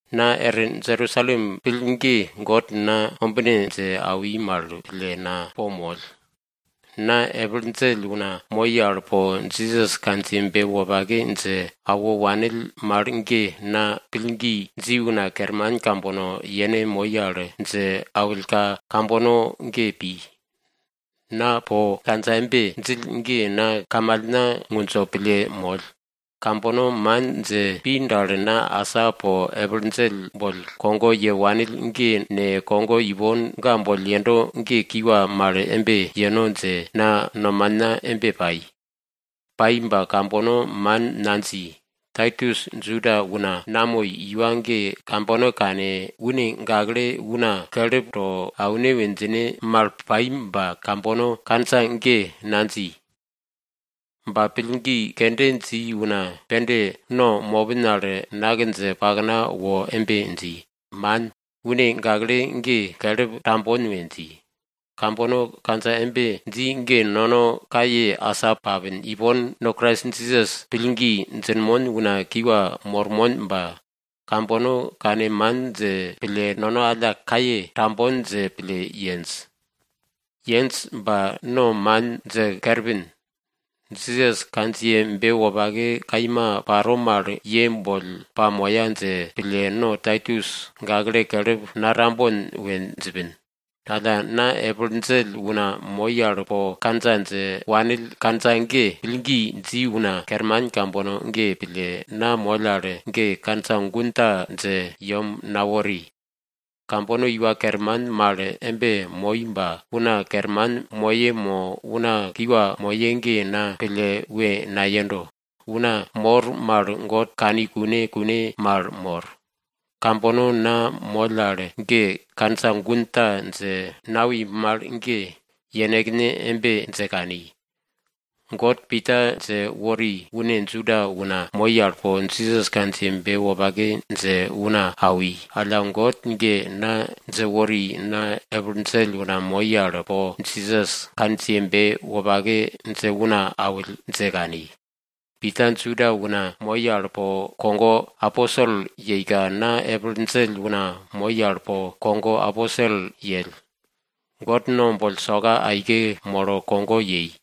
Na er Jerusalem pill ge God na ombine dje awi mal pille na po moll. Na epil djell una moi al po Jisas kandjiyebe wopake dje awo wanill mal ge, na pillgi dji una kerman kambono yene moi al dje awillka kambono ge pi. Na po kandja embe djill ge na kamalna ngundjo pille moll. Kambono man dje pi dal, na asa po epil djell boll kogo ye wanill ge ne, kogo ipon ga boll yendo ge kiwa mal embe yeno dje, na nomana embe pai. Pai ba kambono man nadji. Taitus Juda una namoi iwa ge kambono kane, une gakle una kelip to aune we djine mal pai ba kambono kandja ge nadji. Ba pillgi kende dji una pende no mopin al nak dje pakna wo embe dji, man, une gakle ge kelip tambon we dji. Kambono kandja embe dji ge nono kaye asa papin, ipon no Krais Jisas pillgi djinmon una kiwa mormon ba, kambono kane man dje pille, nono alla kaye tambon dje pille yenj. Yenj ba no man dje kerpin. Jisas kandjiyebe wopake kaima paro mal ye boll pamoya dje pille, no Taitus gakle kelip natambon we djipin. Alla na epil djell una moi al po kandja dje awo wanill kandja ge, pillgi dji una kerman kambono ge pille, na moll al ge kandja gun ta dje pakna nawori. Kambono iwa kerman mal embe moi ba una kerman moye mo una kiwa moye ge na pille we nayendo. Una mor mal God kani kune kune mal mor. Kambono na moll al ge kandja gun ta dje nawi mal ge, yenekne embe dje kani, God Pita dje wori une Juda una moi al po Jisas kandjiyebe wopake dje una awi. Alla God ge na dje wori na epil djell una moi al po Jisas kandjiyebe wopake dje una awill dje kani. Pita Juda una moi al po kogo aposel yeika, na epil djell una moi al po kogo aposel yell. God no boll soka aike molo kogo yei.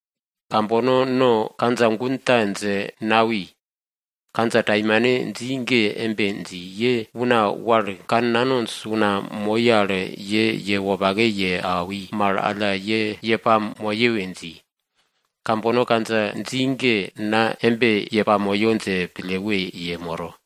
Kambono no kandja gun ta dje nawi. Kandja taimanta dji ge embe dji, ye una wal kannanonj una moi al ye wopake ye awi mal alla ye pamoye we dji. Kambono kandja dji ge na embe ye pamoyo dje pille we yemoro.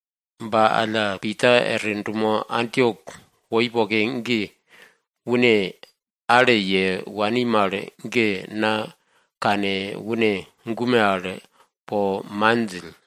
Ba alla Pita er dumo Antiok woi poke ge, une ale ye wani mal ge na kane, une gume al po man djill.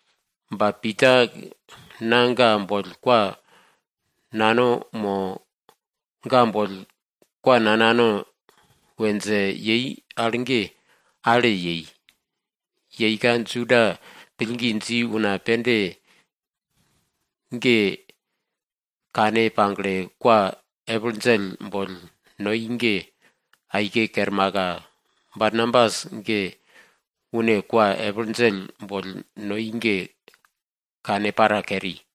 Ba Pita na ga boll kwa nano mo, nanano ne dje pi al ge, ale yei. Yeika Juda pillgi dji una pende ge kane pagle kwa epil djell boll noi ge aike kermaka, Barnabas ge une kwa epil djell boll noi ge kane para keri.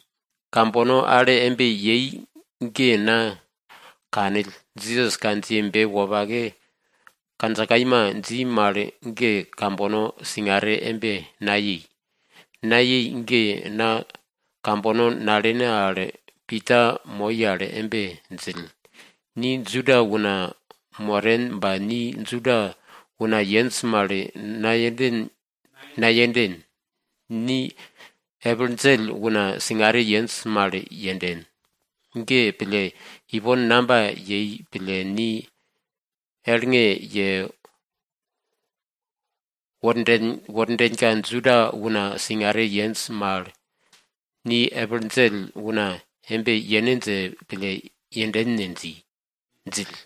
Kambono ale embe yei ge na kanill Jisas kandjiyebe wopake kandja kaima dji mal ge kambono singare embe nayei. Nayei ge na kambono nalene al Pita moi al embe djill, ni Juda una moren ba ni Juda una yenj mal nayenden, ni epil djell una singare yenj mal yenden. Ge pille, ipon namba yei pille, ni elnge yewordenka Juda una singare yenj mal, epil djell una embe yene dje pille yenden ne? djill.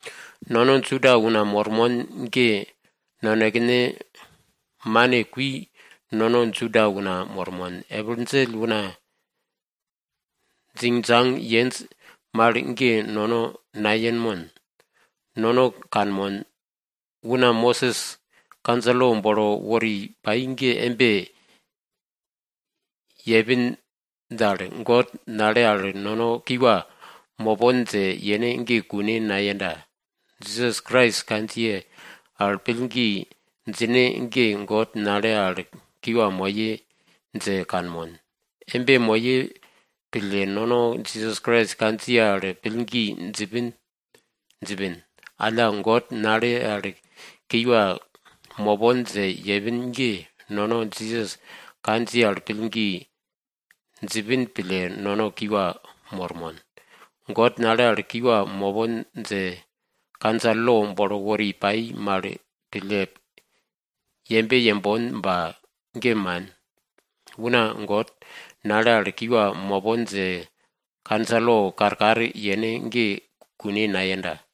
Nono Juda una mormon ge, nonekene mane kui nono Juda una mormon, epil djell una djingdjang yenj mal ge nono nayenmon. Nono kanmon, una Mosis kandja lo bolo wori pai mal ge embe yepin dal, God nale al nono kiwa mopon dje yene ge kune nayenda. Jisas Krais kandjiye al pillgi djine ge, God nale al kiwa moye dje kanmon. Embe moye pille nono Krais Jisas kandjiye al pillgi djipin. Alla God nale al kiwa mopon dje yepin ge, nono Jisas kandjiye al pillgi djipin pille nono kiwa mormon. God nale al kiwa mopon dje kandja lo bolo wori pai mal pille yembe yembon ba, ge man. Una God nale al kiwa mopon dje kandja lo karkar yene ge kune nayenda.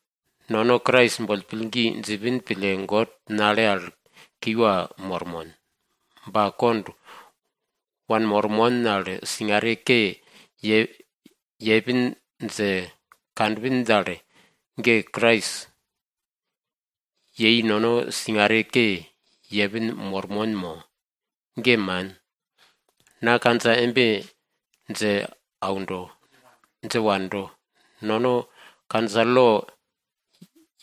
Nono Krais boll pillgi djipin pille God nale al kiwa mormon. Ba kond wanmormon al singare ke yepin dje kanpin dal, ge Krais yei nono singare ke yepin mormon mo? Ge man. Na kandja embe dje wando, nono kandja lo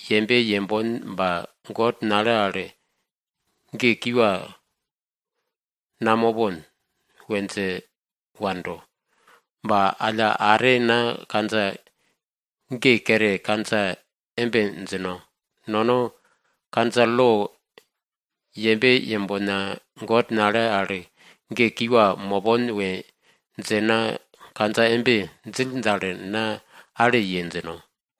yembe yembon ba, God nale al ge kiwa namopon we dje wando. Ba alla are na kandja ge kere kandja embe djino, nono kandja lo yembe yembona, God nale al ge kiwa mopon we dje na kandja embe djill dal, na ale ye djino.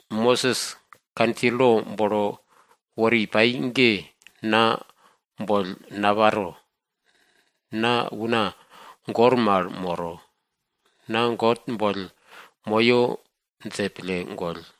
Mosis kandja lo bolo wori pai ge na boll naparo, na una goi mal moro. Na God boll moyo dje pille goll.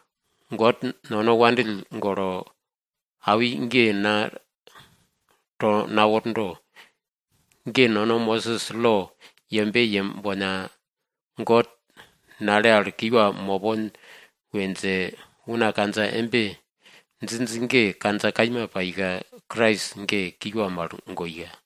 God nono wopake pille awi ge na to nawordo. Ge nono Mosis lo yembe yembona, God nale al kiwa mopon we dje una kandja embe djinj ge, kandja kaima paika, Krais ge kiwa mal goika.